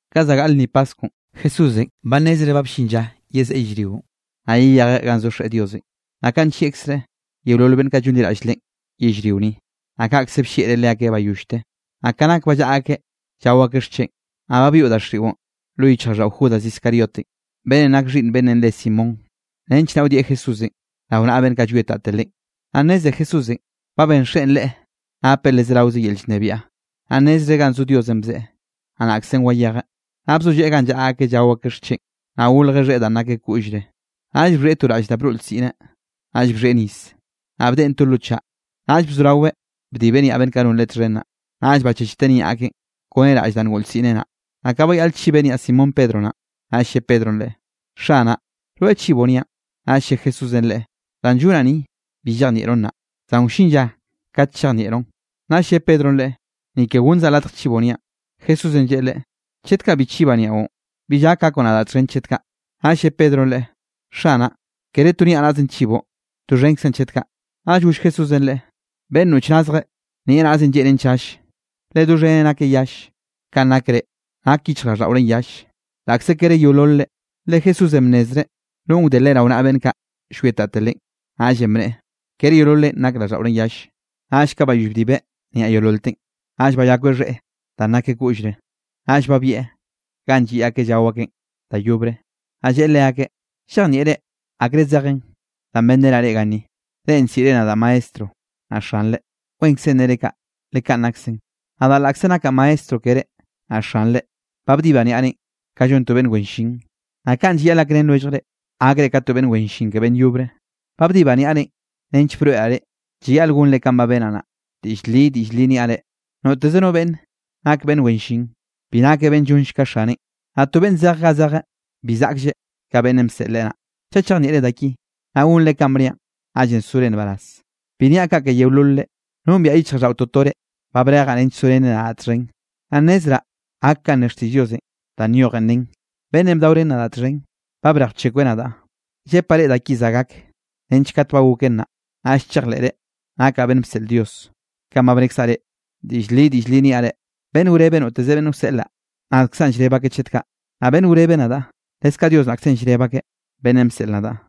Ka za gaꞌl lnni paskwnꞌ Jesúsenꞌ ba nnezreꞌ ba bllin lla yezeꞌe yellrionꞌ, naꞌ yeyejeꞌ ganꞌ zo Xeꞌe Diosenꞌ, naꞌ kanꞌ nllieꞌkzreꞌ yeolol beꞌnn kaꞌ llonliraꞌll Leꞌen yellrio ni, naꞌ kaꞌkze bllieꞌreꞌ leakeꞌ bayollte. Naꞌ ka nak ba llaꞌa akeꞌ llao akeꞌ xcheꞌn, naꞌ ba byoꞌ daxiꞌon lo yichjraꞌlldaꞌo Judas Iscariotenꞌ, beꞌnnenꞌ nak xhiꞌnn beꞌnnenꞌ re Simón, nench naꞌ wdieꞌ Jesúsenꞌ rao naꞌa beꞌnn kaꞌ llwietate Leꞌen. Naꞌ nneze Jesúsenꞌ ba ben Xeꞌen Leꞌe napeꞌ le zeraoze yel llnebiaꞌ, naꞌ nnezreꞌ ganꞌ zo Diosenꞌ bzeꞌe, naꞌ naꞌkzenꞌ wayejeꞌ. Naꞌ bzolleꞌe ganꞌ llaꞌa akeꞌ llao akeꞌ xcheꞌn, naꞌ golje xheꞌe danꞌ nakeꞌ koꞌllreꞌ, naꞌll bxhieꞌ to raꞌll da broꞌ lsiꞌneꞌ. Naꞌll bxhieꞌ nis, naꞌ bdeꞌen to lo chaꞌ, naꞌll bzoraweꞌ bdibeꞌ niaꞌ beꞌnn kaꞌ non Leꞌe txhen naꞌ, naꞌll bachechteꞌ niaꞌ akeꞌn kone raꞌll danꞌ ngoꞌ lsiꞌneꞌ naꞌ. Naꞌ ka bayaꞌl chibeꞌ niaꞌ Simón Pedro naꞌn, naꞌll lle Pedronꞌ Leꞌe: —Xanaꞌ, ¿rweꞌ chiboꞌ niaꞌn? Naꞌll lle Jesúsenꞌ leꞌe: —Danꞌ llonaꞌ ni bi llejnieꞌroꞌn nnaꞌ, zan wllin lla kat chejnieꞌroꞌn. Naꞌll lle Pedronꞌ Leꞌe: —Ni ke gonnzaꞌ latj chiboꞌ niaꞌn. Jesúsenꞌ lleꞌe leꞌe: —Chet kaꞌ bi chibaꞌ niaꞌon, bill gak gakoꞌ nadaꞌ txhen chet kaꞌ. Naꞌll lle Pedronꞌ Leꞌe: —Xanaꞌ, kere to niaꞌnaꞌzenꞌ chiboꞌ, doxhenkzaꞌn chet kaꞌ. Naꞌll goll Jesúsenꞌ leꞌe: —Beꞌnn noꞌch nazjeꞌ, nieꞌ naꞌzeꞌn lleꞌnen chall, le doxheneꞌ nakeꞌ yalle. Kanꞌ nak reꞌ, nak yichjraꞌlldaꞌorenꞌ yalle, laꞌkze kere yeololre. Le Jesúsenꞌ bnnezreꞌ nonꞌ wde Leꞌe rao naꞌa beꞌnn kaꞌ llwietate Leꞌe. Naꞌllenꞌ bneꞌe: “Kere yeololrenꞌ nak raꞌlldaꞌorenꞌ yalle.” Naꞌll ka bayoll bdibeꞌ niaꞌ yeololteꞌn, naꞌll bayakweꞌ xheꞌe danꞌ nakeꞌ koꞌllre, naꞌll babieꞌ ganꞌ lliꞌ akeꞌ llao akeꞌn da yobre. Naꞌ lleꞌe leakeꞌ: —¿Llejnieꞌre akre zejen danꞌ benrenaꞌ reꞌ ganni? Reꞌ nsiꞌre nadaꞌ Maestro naꞌ xanre, wenkzenꞌ nere kaꞌ, le kaꞌn naksaꞌ. Nadaꞌ laꞌkze nakaꞌ maestro keré naꞌ xanre, ba bdibaꞌ niaꞌrenꞌ ka llon to beꞌnn wen llin, naꞌ kaꞌn llayaꞌl gakrén lwelljre, gakre ka to beꞌnn wen llin ke beꞌnn yobre. Ba bdibaꞌ niaꞌrenꞌ nench broeꞌraꞌ reꞌ, llayaꞌl gonre kanꞌ ba benaꞌ naꞌ. Diꞌll li, diꞌll li niaꞌ reꞌ: Noteze no beꞌnn nak beꞌnn wen llin, bi nakeꞌ beꞌnn llonlle ka xaneꞌn, naꞌ to beꞌnn zej ga zejeꞌ, bi zaꞌklleꞌ ka beꞌnnenꞌ bseꞌl leꞌe naꞌ. Chaꞌ chejnieꞌre da ki, naꞌ gonre kanꞌ bniaꞌn, naꞌllenꞌ sore nbaraz. ’Bi niaꞌ kaꞌ ke yeololre. Nombiaꞌ yichjraꞌlldaꞌo toto reꞌ ba brejaꞌ nench sorenre nadaꞌ txhen. Naꞌ nnezraꞌ gak kanꞌ ne xtiꞌll Diosenꞌ danꞌ nyojen nen: “Beꞌnnenꞌ bdaorén nadaꞌ txhen, ba brej bchekweꞌ nadaꞌ.” Llepaꞌ reꞌ da ki za gak, nench kat ba goken naꞌ, naꞌll chejleꞌre nakaꞌ beꞌnn bseꞌl Dios, kanꞌ ba bnekzaꞌ reꞌ. Diꞌll li, diꞌll li niaꞌ reꞌ: Beꞌnn wrebe noteze beꞌnn llseꞌlaꞌ, nadkzaꞌn llreb akeꞌ chet kaꞌ, naꞌ beꞌnn wrebe nadaꞌ, leskaꞌ Dios naꞌkzenꞌ, llreb akeꞌ, beꞌnnenꞌ bseꞌl nadaꞌ.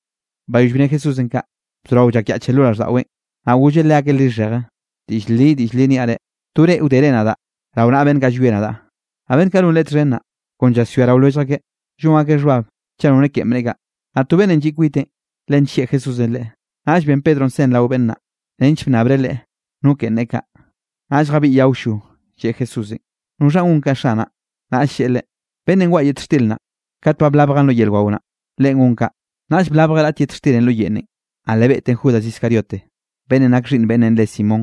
Bayoll bne Jesúsenꞌ kaꞌ, bzorao llakyaꞌcheꞌ lo raꞌlldaꞌweꞌn, naꞌ golleꞌ leakeꞌ lixheje: —Diꞌll li, diꞌll li niaꞌ reꞌ: To reꞌ wdere nadaꞌ rao naꞌa beꞌnn kaꞌ llwie nadaꞌ. Naꞌ beꞌnn kaꞌ non Leꞌe txhen naꞌ, kon llaswia rao lwellj akeꞌ, llon akeꞌ xhbab chaꞌ nore keꞌen bneꞌe kaꞌ. Naꞌ to beꞌnnenꞌ lliꞌ kwiteꞌn, le nllieꞌ Jesúsenꞌ leꞌe. Naꞌll ben Pedronꞌ sen rao beꞌnn naꞌ, nench bnnabreꞌ Leꞌe no keꞌen neꞌe kaꞌ. Naꞌll jabiꞌyeꞌ awllo, lleꞌe Jesúsenꞌ: —¿Noxhanꞌ gon kaꞌ, Xanaꞌ? Naꞌll lleꞌe leꞌe: —Beꞌnnenꞌ waꞌa yet xtir naꞌ kat ba blabjaꞌn lo yel wao naꞌ, leꞌen gon kaꞌ. Naꞌll blabjeꞌ raꞌt yet xtirenꞌ lo yeꞌnnenꞌ, naꞌ le beꞌteꞌn Judas Iscariote, beꞌnnenꞌ nakeꞌ xhiꞌnn beꞌnnenꞌ re Simón.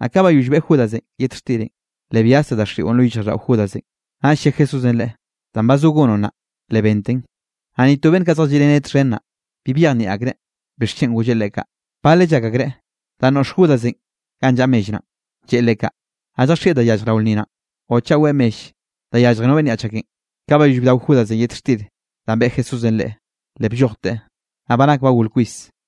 Naꞌ ka bayoll beꞌe Judasenꞌ yet xtirenꞌ, le byazte daxiꞌon lo yichjraꞌlldaꞌo Judasenꞌ. Naꞌll lle Jesúsenꞌ leꞌe: —Danꞌ ba zo gonoꞌ naꞌ, le benten. Naꞌ ni to beꞌnn kaꞌ zjalliꞌreneꞌ txhen naꞌ, bi byejnieꞌ akreꞌ bixchen golleꞌ leꞌe kaꞌ. Baleꞌ llak akreꞌ danꞌ noꞌx Judasenꞌ ganꞌ llaꞌa mell naꞌn, lleꞌe leꞌe kaꞌ, naꞌ lljaxieꞌ da yallj rao lnni naꞌn o chaꞌ weꞌe mell da yallje no beꞌnn yaꞌch akenꞌ. Ka bayoll bdao Judasenꞌ yet xtir danꞌ beꞌe Jesúsenꞌ leꞌe, le bllojteꞌ. Naꞌ ba nak ba gol kwis.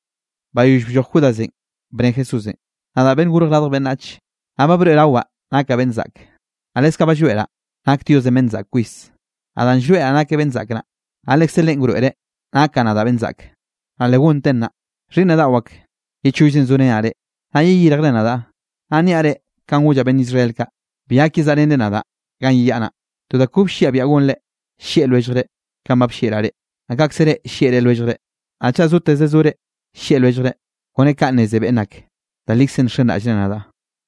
Bayoll blloj Judasenꞌ, bne Jesúsenꞌ: —Nadaꞌ Beꞌnnenꞌ Gorj Radj Beꞌnnach, naꞌ ba broeꞌrawaꞌ nakaꞌ beꞌnn zaꞌke, naꞌ leskaꞌ ba llroeꞌraꞌ nak Diosenꞌ beꞌnn zaꞌk kwis. Naꞌ danꞌ llroeꞌraꞌ nakeꞌ beꞌnn zaꞌk naꞌ, naꞌ lekze Leꞌen wroeꞌreꞌ nakaꞌ nadaꞌ beꞌnn zaꞌke, naꞌ le gonteꞌn nnaꞌ. Xhiꞌnnaꞌ daꞌo ak, ye chollzenꞌ zorenaꞌ reꞌ. Naꞌ yeyirjre nadaꞌ, naꞌ niaꞌ reꞌ kanꞌ gollaꞌ beꞌnn Israel kaꞌ, bi gak yezaꞌrenre nadaꞌ ganꞌ yeyaꞌa naꞌ. To da kobe lliaꞌ biaꞌa gonre, llieꞌ lwelljre. Kanꞌ ba bllieꞌraꞌ reꞌ, naꞌ kaꞌkze reꞌ llieꞌre lwelljre. Naꞌ chaꞌ soteze sore llieꞌ lwelljre, kone kaꞌ nneze beꞌnn ak, da likzenꞌ nxenraꞌllre nadaꞌ.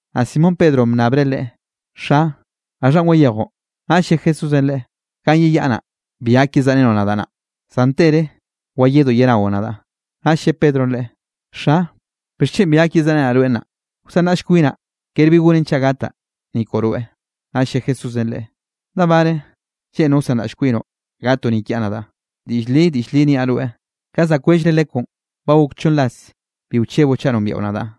Naꞌ Simón Pedronꞌ bnnabreꞌ Leꞌe: —Xa, ¿gaxhanꞌ wayejoꞌ? Naꞌll lle Jesúsenꞌ leꞌe: —Ganꞌ yeyaꞌa naꞌ, bi gak yezaꞌrenoꞌ nadaꞌ nnaꞌ, zan tere wayedoꞌ yenaoꞌ nadaꞌ. Naꞌll lle Pedronꞌ Leꞌe: —Xa, ¿bixchen bi gak yezaꞌrenaꞌ rweꞌ nnaꞌ? Wsanraꞌll kwinaꞌ kere bi gonen chaꞌ gataꞌ, ni koꞌo rweꞌ. Naꞌll lle Jesúsenꞌ leꞌe: —¿Da bare lleꞌnroꞌ wsanraꞌll kwinoꞌ gatoꞌ ni kiaꞌ nadaꞌ? Diꞌll li, diꞌll li niaꞌ rweꞌ: Ka za kwellre lekwnꞌ ba gok chonn ras bi wcheboꞌ chaꞌ nombiaꞌo nadaꞌ.